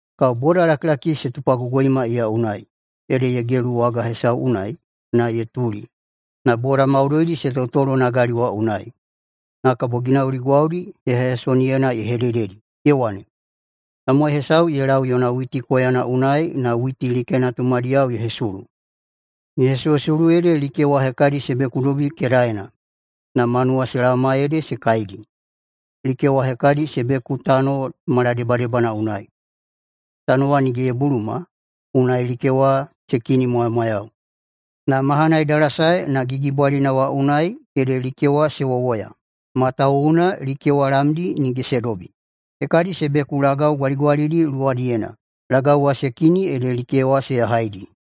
Kabo bodalakilaki se tupagogoima iya unai, ede ye gelu waga hesau unai na ye tuli, na boda maudoidi se totolo nagali wa unai. Na kabo ginauli gwaudi heyaheyasoniyena ye hedededi. Ye wane, “Tamowai hesau ye lau yona witi koyana unai na witi likena tumadiyao ye hesulu. Ye hesuhesulu ede like wa hekadi se bekudobi kedaena. Na manuwa se laoma ede se kaidi. Like wa hekadi se beku tano maladebadebana unai. Tano wa nige ye buluma, unai like wa se kinimwamwayau. Na mahana ye dalasae na gigibwalina wa unai ede like wa se wowoya, matawuwuna like wa lamdi nige se dobi. Hekadi se beku lagau gwaligwalidi luwadiyena. Lagau wa se kini ede like wa se yahaidi.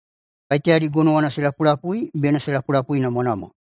Kaiteyadi gonowana se lapulapui bena se lapulapuinamwanamwa!”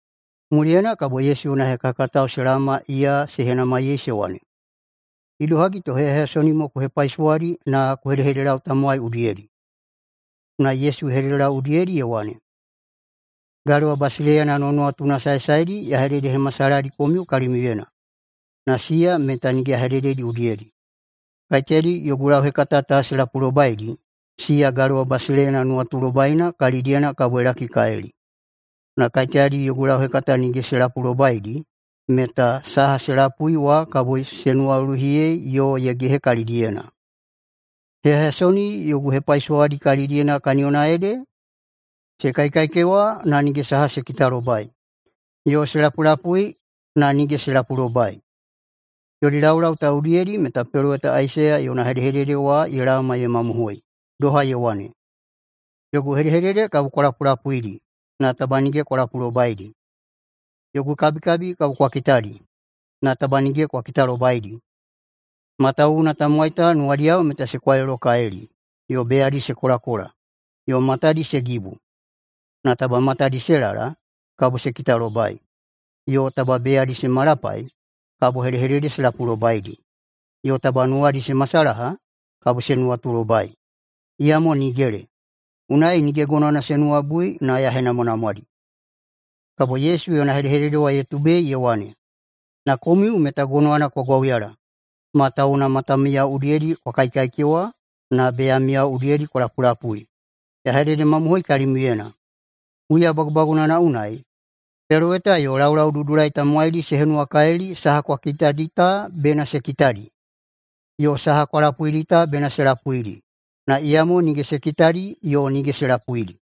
Muliyena kabo Yesu yona hekahekatao se laoma iya se henamaiyei se wane, “Idohagi to heyaheyasoni ku hepaisowadi na ku hedehededelau tamowai udiyedi?” Unai Yesu ye hededelau udiyedi ye wane, “Galewa basileiyana nuwanuwatuna saesaedi ya hededehemasalahadi komiu kalimiuyena, na siya meta nige ya hedededi udiyedi. Kaiteyadi yogu lauhekata ta se lapulobaidi, siya galewa basileiyana nuwatulobaina kalidiyena kabo ye lakikalili. Na kaiteyadi yogu lauhekata nige se lapulobaidi meta saha se lapui wa kabo se nuwaluluhiyei yo ye gehe kalidiyena. Heyaheyasoni yogu hepaisowadi kalidiyena kaniyona ede ‘se kaikaikewa, na nige saha se kitalobai, yo se lapulapui, na nige se lapulobai.’ Yodi laulau ta udiyedi meta peloweta Aisaiya yona hedehedede wa ye laoma ye mamohoi, doha ye wane, ‘Yogu hedehedede kabo kwa lapulapuidi, na taba nige kwa lapulobaidi. Yogu kabikabi kabo kwa kitadi, na taba nige kwa kitalobaidi. Matawuwuna tamowai ta nuwadiyao meta se kwailolokalili, yo beyadi se kolakola, yo matadi se gibu. Na taba matadi se lala, kabo se kitalobai, yo taba beyadi se malapai, kabo hedehedede se lapulobaidi, yo taba nuwadi se masalaha, kabo se nuwatulobai, iyamo nigele. Unai nige gonowana se nuwabui na ya henamwanamwadi.’” [Kabo Yesu yona hedehedede wa ye tubei ye wane,] “Na komiu meta gonowana kwa gwauyala matawuwuna matamiyao udiyedi kwa kaikaikewa na beyamiyao udiyedi kwa lapulapui. Ya hededemamohoi kalimiuyena: [Huya bagubagunana unai,] peloweta yo laulaududulai tamowaidi se henuwakalili saha kwa kitadi ta bena se kitadi, yo saha kwa lapuidi ta bena se lapuidi, na iyamo nige se kitadi yo nige se lapuidi.”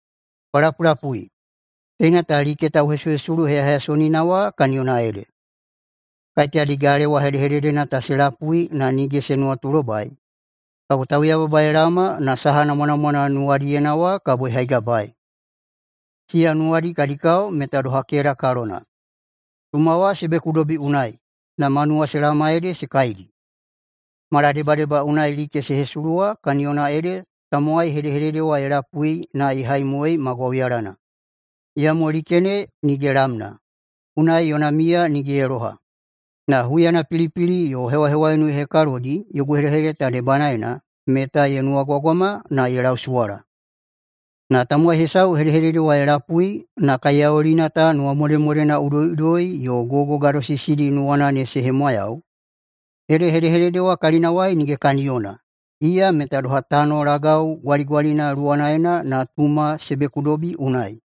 “Kwa lapulapui, teina ta like tauhesuhesulu heyaheyasonina wa kaniyona ede: Kaiteyadi galewa hedehededena ta se lapui na nige se nuwatulobai, kabo tauyababa ye laoma na saha namwanamwana nuwadiyena wa ye haigabaei. Siya nuwadi kadi kao meta doha keda kalona. Tuma wa se bekudobi unai na manuwa se laoma ede se kaidi. Maladebadeba unai like se hesulu wa kaniyona ede tamowai hedehedede wa ye lapui na ye haimoei ma gwauyalana. Iyamo like ne nige lamna, unai yona miya nige ye loha. Na huyana pilipili yo hewahewaiunu ye hekalodi yogu hedehedede ta debanaena meta ye nuwagwagwama na ye lausuwala. Na tamowai hesau hedehedede wa ye lapui na kaiyaulina ta nuwamodemodena udoiꞌudoi yo gogo gadosisidi nuwana ne se hemwayau, ede hedehedede wa kalinawai nige kaniyona. Iya meta doha tano lagau gwaligwalina luwanaena na tuma se bekudobi unai.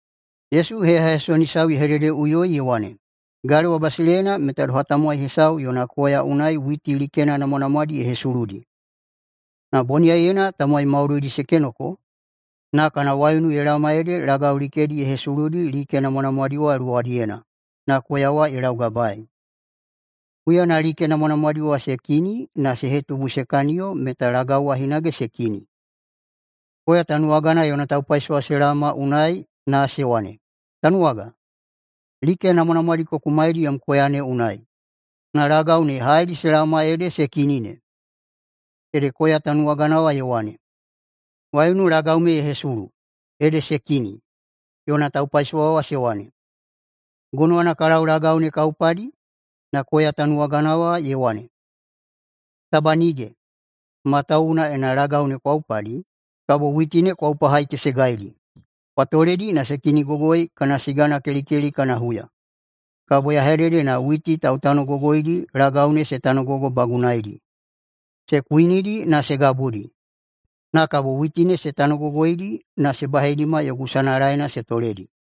Yesu heyaheyasoni hesau ye hededeꞌuyoi ye wane, “Galewa basileiyana meta doha tamowai hesau yona koya unai witi likena namwanamwadi ye hesuludi. Na boniyaiyena tamowai maudoidi se kenoko, na kana waiunu ye laoma ede lagau likedi ye hesuludi like namwanamwadi wa luwadiyena, na koya wa ye laugabaei. Huyana like namwanamwadi wa se kini na se hetubu se kaniyo meta lagau wa hinage se kini. Koya tanuwagana yona taupaisowa se laoma unai na se wane, ‘Tanuwaga, like namwanamwadi ku kumaidi yom koya ne unai, na lagau ne haedi se laoma ede se kini ne?’ Ede koya tanuwagana wa ye wane, ‘Waiunu lagau me ye hesulu, ede se kini.’ Yona taupaisowa wa se wane, ‘Gonowana ka lau lagau ne ka upadi?’ Na koya tanuwagana wa ye wane, ‘Taba nige, matawuwuna ena lagau ne kwa upadi, kabo witi ne kwa upahaikesegaidi. Kwa toledi na se kinigogoi kana siga kelikeli kana huya, kabo ya hedede na witi tautanogogoidi lagau ne se tanobagunaeidi se kuinidi na se gabudi, na kabo witi ne se tanogogoidi na se baheidima yogu sanalaena se toledi.’”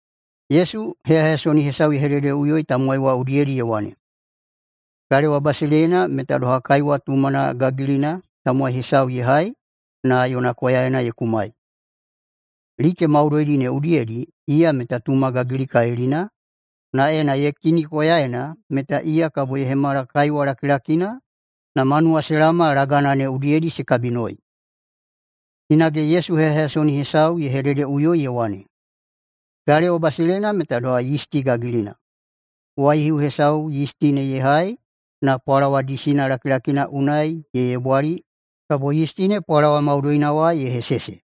Yesu heyaheyasoni hesau ye hededeꞌuyoi tamowai wa udiyedi ye wane, “Galewa basileiyana meta doha kaiwa tumana gagilina tamowai hesau ye hai na yona koyaena ye kumai. Like maudoidi ne udiyedi iya meta tuma gagilikalilina, na ena ye kini koyaena meta iya kabo ye hemala kaiwa lakilakina, na manuwa se laoma lagana ne udiyedi se kabinoi.” Hinage Yesu heyaheyasoni hesau ye hededeꞌuyoi ye wane, “Galewa basileiyana meta doha yisti gagilina. Waihiu hesau yisti ne ye hai na pwalawa disina lakilakina unai ye yebwali kabo yisti ne pwalawa maudoina wa ye hesese.”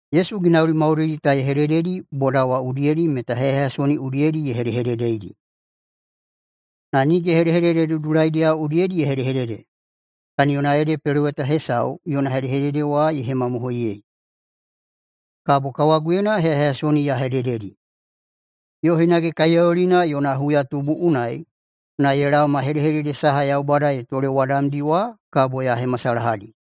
Yesu ginauli maudoidi ta ye hedededi boda wa udiyedi meta heyaheyasoni udiyedi ye hedehededeidi. Na nige hedehedede dudulaidiyao udiyedi ye hedehedede. Kaniyona ede peloweta hesau yona hedehedede wa ye hemamohoiyei, “Kabo kawaguyena heyaheyasoni ya hedededi. Yo hinage kaiyaulina yona huyatubu unai na ye laoma, hedehedede saha Yaubada ye tolewadamdi wa kabo ya hemasalahadi.”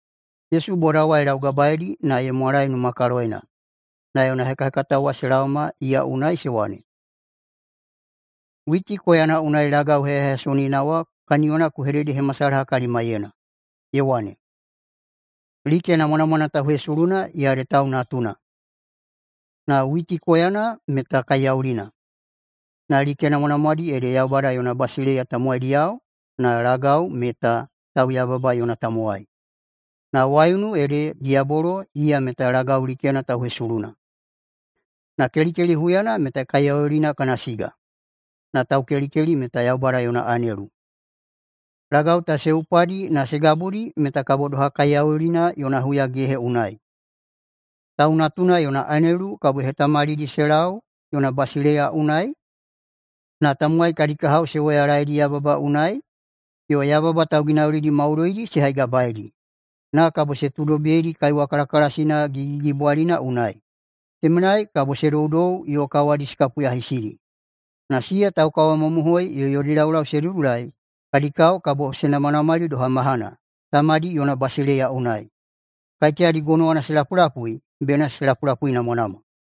Yesu boda wa ye laugabaeidi na ye mwalae numakaloyena. Na yona hekahekatao wa se laoma iya unai se wane, “Witi koyana unai lagau heyaheyasonina wa kaniyona ku hededehemasalaha kalimaiyena.” Ye wane, “Like namwanamwana tauhesuluna, iya ede Tau Natuna. Na witi koyana meta kaiyaulina, na like namwanamwadi ede Yaubada yona basileiya tamowaidiyao, na lagau meta tauyababa yona tamowai, na waiunu ede diyabolo iya meta lagau likena tauhesuluna. Na kelikeli huyana meta kaiyaulina kana siga, na taukelikeli meta Yaubada yona anelu. Lagau ta se upadi na se gabudi meta kabo doha kaiyaulina yona huyagehe unai. Tau Natuna yona anelu kabo ye hetamalidi se lau yona basileiya unai, na tamowai kadi kahao se woyalaeidi yababa unai, yo yababa tauginaulidi maudoidi se haigabaeidi, na kabo se tuudobiyeidi kaiwa kalakalasina gigigigibwalikalilina unai. Temenai kabo se doudou yo kawadi se kapuyahisidi. Na siya taukawamamohoi yo yodi laulau se dudulai kadi kao kabo se namanamali doha mahana, Tamadi yona basileiya unai. Kaiteyadi gonowana se lapulapui bena se lapulapuinamwanamwa!”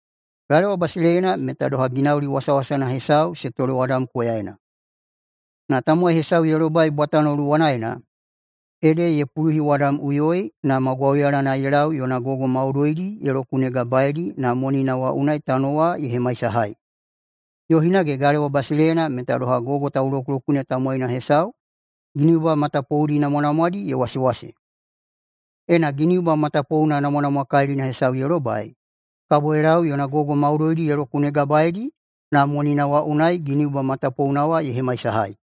“Galewa basileiyana meta doha ginauli wasawasana hesau se tolewadam koyaena. Na tamowai hesau ye lobai bwatano luwanaena, ede ye puluhiwadamꞌuyoi, na ma gwauyalana ye lau yona gogo maudoidi ye lokunegabaeidi na monina wa unai tano wa ye hemaisahai. Yo hinage galewa basileiyana meta doha gogo taulokulokune tamowaina hesau giniuba matapoudi namwanamwadi ye wasewase. Ena giniuba matapouna namwanamwakalilina hesau ye lobai, kabo ye lau yona gogo maudoidi ye lokunegabaeidi na monina wa unai giniuba matapouna wa ye hemaisahai.”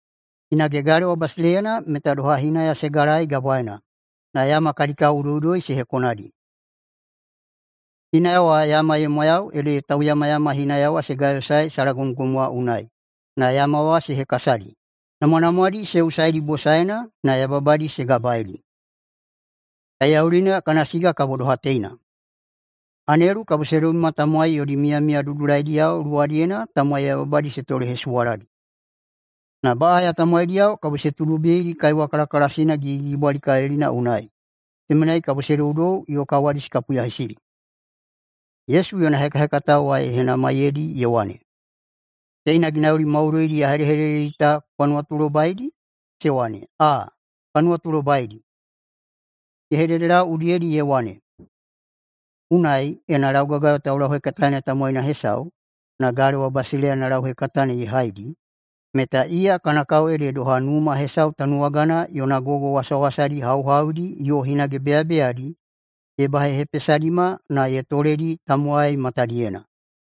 “Hinage galewa basileiyana meta doha hinaya se galaei gabwaena, na yama kadi kao udoiꞌudoi se hekonadi. Hinaya wa yama ye mwayau ede tauyamayama hinaya wa se gayosaei salagomgom wa unai na yama wa se hekasadi, namwanamwadi se usaidi bosaena na yababadi se gabaeidi. Kaiyaulina kana siga kabo doha teina: Anelu kabo se dobima tamowai yodi miyamiya dudulaidiyao luwadiyena tamowai yababadi se tolehesuwaladi. Na baꞌaya tamowaidiyao kabo se tuudobiyeidi kaiwa kalakalasina gigigigibwalikalilina unai. Temenai kabo se doudou yo kawadi se kapuyahisidi.” Yesu yona hekahekatao wa ye henamaiyeidi ye wane, “Teina ginauli maudoidi ya hedededi ta kwa nuwatulobaidi?” Se wane, “Aa, ka nuwatulobaidi.” Ye hededelau udiyedi ye wane, “Unai, ena laugagayo taulauhekataena tamowaina hesau, na galewa basileiyana lauhekatana ye haidi, meta iya kana kao ede doha numa hesau tanuwagana yona gogo wasawasadi hauhaudi yo hinage beyabeyadi ye bahehepesadima na ye toledi tamowai matadiyena.”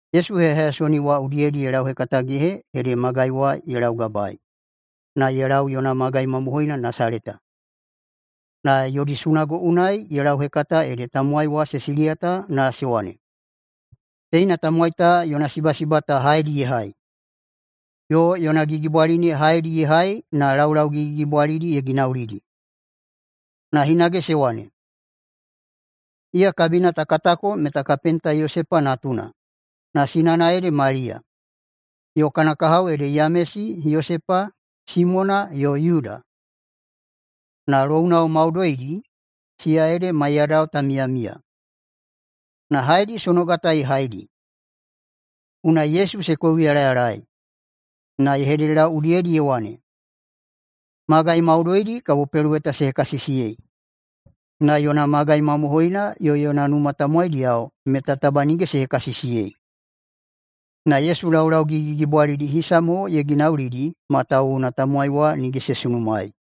Yesu heyaheyasoni wa udiyedi ye lauhekatagehe ede magai wa ye laugabaei na ye lau yona magai mamohoina Nasaleta. Na yodi sunago unai ye lauhekata ede tamowai wa se siliyata na se wane, “Teina tamowai ta yona sibasiba ta haedi ye hai? Yo yona gigibwali ne haedi ye hai na laulau gigigigibwalidi ye ginaulidi?” Na hinage se wane, “Iya kabina ta katako meta kapenta Yosepa natuna, na sinana ede Maliya, yo kana kahao ede Yamesi, Yosepa, Simona, yo Yuda. Na lounao maudoidi, siya ede maiyadao ta miyamiya! Na haedi sonoga ta ye haidi?” Unai Yesu se kouyalayalaei. Na ye hededelau udiyedi ye wane, “Magai maudoidi kabo peloweta se hekasisiyei, na yona magai mamohoina yo yona numa tamowaidiyao meta taba nige se hekasisiyei.” Na Yesu laulau gigigigibwalidi hisa mo ye ginaulidi, matawuwuna tamowai wa nige se sunumaei.